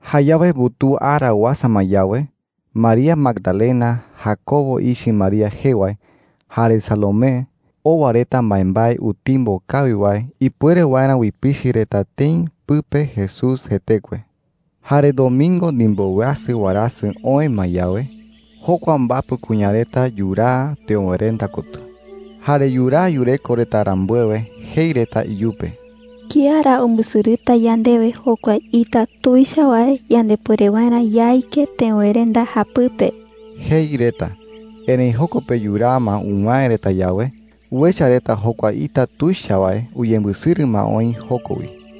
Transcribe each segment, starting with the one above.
Jayawe mbutuu ara uasa ma yawe, María Magdalena, Jacobo ichɨ María jee wae, jare Salomé owa reta mbaembae utimbo kawi wae ipuere waerä uipichɨ reta tëi pɨpe Jesús jetekue. Jare domingo ndimboweasɨ warasɨ oë ma yawe, jokua mbapɨ kuña reta yuraa teöwerenda kotɨ. Jare yuraa yureko reta rambuewe, jei reta iyupe: “¿Kía ra umbɨsɨrɨta yandewe jokua ita tuicha wae yandepuere waerä yaike teöwerenda japɨpe?” jei reta. Erëi joko pe yuraa ma uwäe reta yawe, uecha reta jokua ita tuicha wae uyembɨsɨrɨ ma oï joko wi.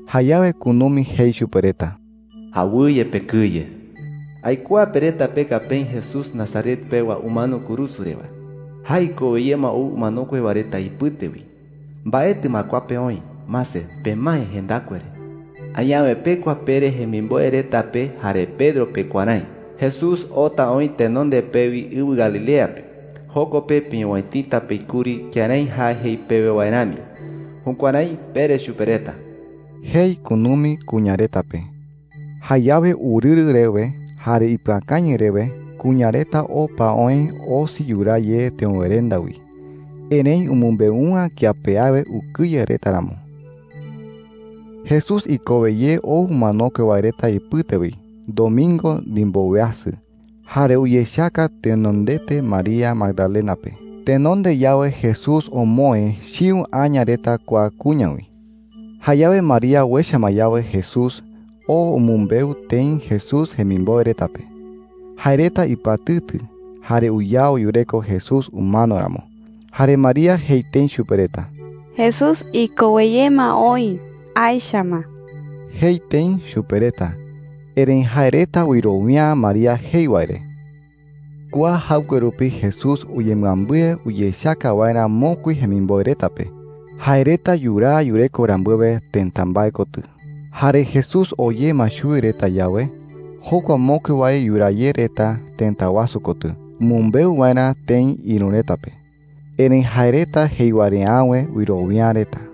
Jayawe kunumi jei chupe reta: “Awɨye pekɨye,” jei. “Aikuaa pe reta peka peï Jesús Nazaret pewa umano kurusu re wae. Jae ikowe ye ma ou umanokue wae reta ipɨte wi. Mbaetɨ ma kua pe oï. Mase, pemae jendakue re,” jei chupe reta. “Añawe pekua pere jemimboe reta pe jare Pedro pe kuärái: ‘Jesús oota oï tenonde pewi ɨwɨ Galilea pe. Joko pe peowäitita peï kuri kërái jae jei pewe wae rami.’ Jukuärái pere chupe reta,” jei kunumi kuña reta pe. Jayawe urɨrɨ rewe jare ipɨakañɨ rewe kuña reta opa oë osi yuraa ye teöwerenda wi. Erëi umɨmbeu’ä kía pe awe ukɨye reta ramo. Jesús ikowe ye ou umanokue wae reta ipɨte wi domingo ndimboweasɨ. Jare uyechaka tenondete María Magdalena pe. Tenonde yawe Jesús omoë chiu aña reta kua kuña wi. Jayawe María uecha ma yawe Jesús, oo umɨmbeu tëi Jesús jemimboe reta pe. Jae reta ipɨatɨtɨ jare uyao yureko Jesús umano ramo. Jare María jei tëi chupe reta: “¡Jesús ikowe ye ma oï! Aecha ma,” jei tëi chupe reta. Erëi jae reta wɨrowia’ä María jei wae re. Kua jaɨkue rupi Jesús uyembɨambɨe uyechaka waerä mokui jemimboe reta pe, jae reta yuraa yureko rambuewe tëta mbae kotɨ. Jare Jesús oo ye ma chuwi reta yawe, jokua mokui wae yuraa ye reta tëta wasu kotɨ umɨmbeu waerä tëi ïru reta pe. Erëi jae reta jei wae re awe wɨrowia’ä reta.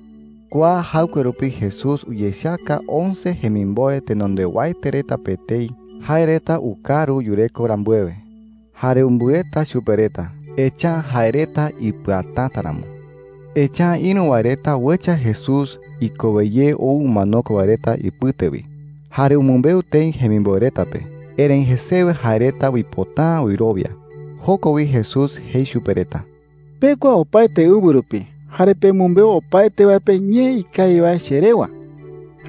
Kua jaɨkue rupi Jesús uyechaka once jemimboe tenondewaete reta pe etei jae reta ukaru yureko rambuewe. Jare umbɨeta chupe reta, echa’ä jae reta ipɨatäta ramo. Echa’ä ïru wae reta uecha Jesús ikowe ye ou umanokue wae reta ipɨte wi, jare umɨmbeu tëi jemimboe reta pe. Erëi jesewe jae reta uipota’ä wɨrowia. Joko wi Jesús jei chupe reta: “Pekua opaete ɨwɨ rupi jare pemɨmbeu opaete wae pe ñee ikawi wae che rewa,” jei chupe reta.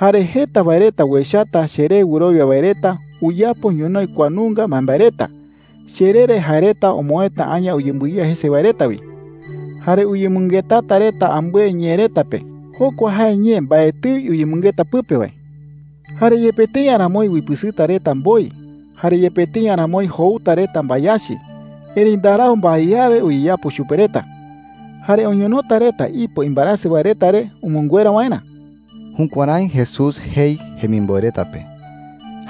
“Jare jeta wae reta uechata cheré wɨrowia wae reta uyapo ñonoï kua nunga mbaembae reta: Cheree re jae reta omoëta aña uyembɨiya jese wae reta wi. Jare uyemɨngetata reta ambɨe ñee reta pe – jokua jae ñee mbaetɨi uyemɨngeta pɨpe wae. Jare yepe tëi aramoi uipɨsɨta reta mboi, jare yepe tëi aramoi jouta reta mbayachi, erëi ndarau mbae awe uyeyapo chupe reta. Jare oñonota reta ipo imbaerasɨ wae reta re umɨnguera waerä.” Jukuärái Jesús jei jemimboe reta pe.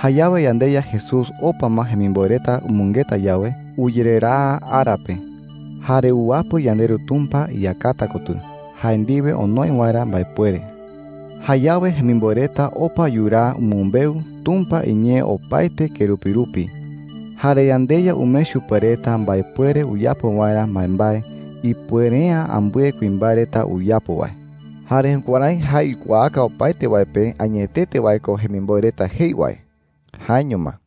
Jayawe yandeYa Jesús opa ma jemimboe reta umɨngeta yawe, uyereraa ara pe. Jare uwapɨ yandeRu Tumpa iyakata kotɨ jae ndiwe onoi waerä mbaepuere. Jayawe jemimboe reta opa yuraa umɨmbeu Tumpa iñee opaete kerupi rupi. Jare yandeYa umee chupe reta mbaepuere uyapo waerä mbaembae ipuere’ä ambɨe kuimbae reta uyapo wae. Jare jukuärái jae uikuaaka opaete wae pe añetete wae ko jemimboe reta jei wae. Jaeño ma.